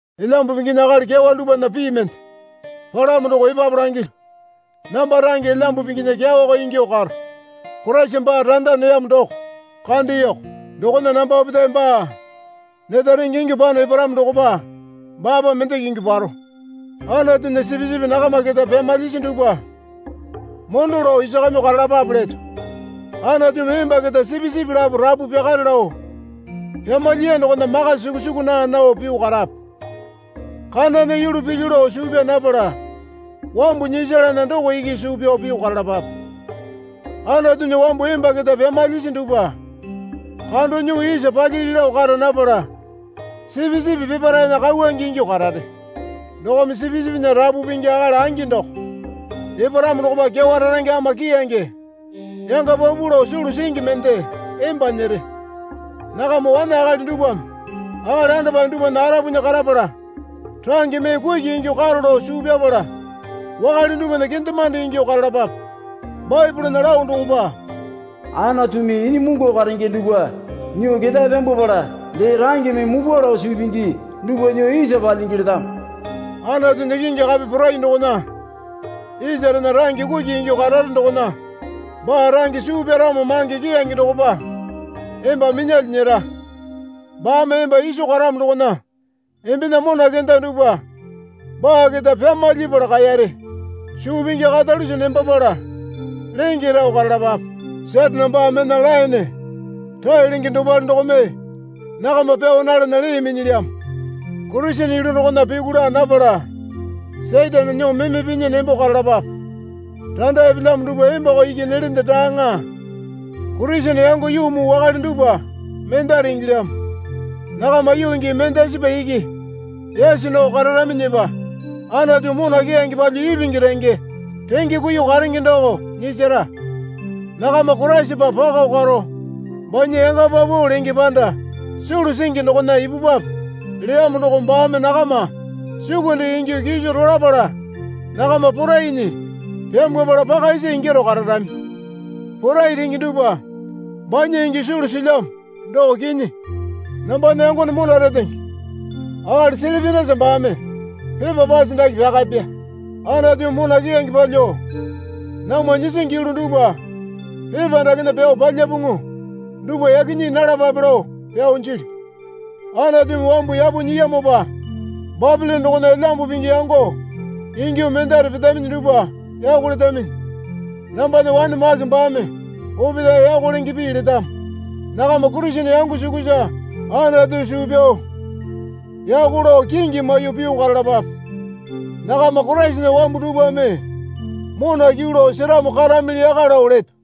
Elyambu Pinginya akali kyawa dupwana pii mende palamo doko epapu langilyu. Namba range Elyambu Pinginya kyawako ingyuo karo. Koraisa baa randa neyamo doko kandeyoko. Dokona namba opetae baa neta renge ingyuo pano eparamo dokopa baapa mendeke ingyuo paro. Anatunya sipisipi nakama keta pyamalyisi dupwa mondo lao isakamyuo karalapape leto. Anatumi emba keta sipisipi lapo rapu pyakare lao pyamalyiya dokona maka sukusuku naa nao pyuo karape. Kanana yulu pilyu lao suu pyaa napala wambu nyisalana doko iki suu pyao pyuo karalapape. Anatunya wambu emba keta pyamalyisi dupwa kando nyuo isa palyili lao kara napala sipisipi peparaena kauwange ingyuo karare. Dokome Sipisipinya Rapu Pingi akali angi doko eparamo dokopa kyawa rarange ama keyange yanga paupau lao sulu singi mende emba nyere. Nakama wane akali dupwame akali andapae dupwana arapunya karapala range mee kuki ingyuo karo lao suu pyapala wakale dupwana kendemande ingyuo karalapape. Baepolena lao dokopa, Anatumi inyimungu karenge dupwa nyuo ketae pyambwapala dee rangeme mupwa lao suu pingi dupwa nyuo isa palyingi letamo. Anatunya kingi kape porai dokona isarena range kuki ingyuo karare dokona baa range suu pyaramo mange keyange dokopa emba minyalyuo nyera. Baame emba iso karamo dokona embena mona kenda dupwa baa keta pyamalyapala kaeyare. Suu pingi karalunja nembapala lenge rao karalapape. Satane baa mena laene rae lenge dopale dokome nakama pyao nalana lee minyilyamo. Kurisene yulu dokona pyuku laa napala Satane nyuo meme pinyi nembo karalapape. Randa epelyamo dupwa embako iki nelende daaŋa. Kurisene yango yuu muu wakale dupwa mendare ingilyamo. Nakama yuu gii mendasipa iki yaso nao kararaminyipa Anatu mona keyange palyuo ipingi renge renge kuiyuo karenge doko nyisara. Nakama Koraisapa pako karo banya yanga paupau lenge panda sulu singi dokona ipupwape leyamo doko baame nakama sukunde ingyuo kiso rolapala nakama porainyi pyambwapala paka isa ingyaro kararami. Porai renge dupwa banya ingyuo sulu silyamo, doko kinyi. Nambana yangone mona retenge akali Silipenasa baame pepa pase dake pyakapya. Anatumi mona keyange palyuo namwa nyisingi yulu dupwa pepa dakena pyao palyapuŋu dupwa yaki nyii nalapape lao pyao jilyu. Anatumi wambu yapo nyiyamopa Bapilone dokona Elyambu Pingi yango ingyuo mendare petaminyi dupwa yako letaminyi. Nambana wane Make baame opetae yako lenge pii letamo. Nakama Kurisene yango sukusa Anatu suu pyao yako lao kingi maiyuo pyuo karalapape. Nakama Koraisana wambu dupwame mona kyuu lao seramo karamili yaka lao leto.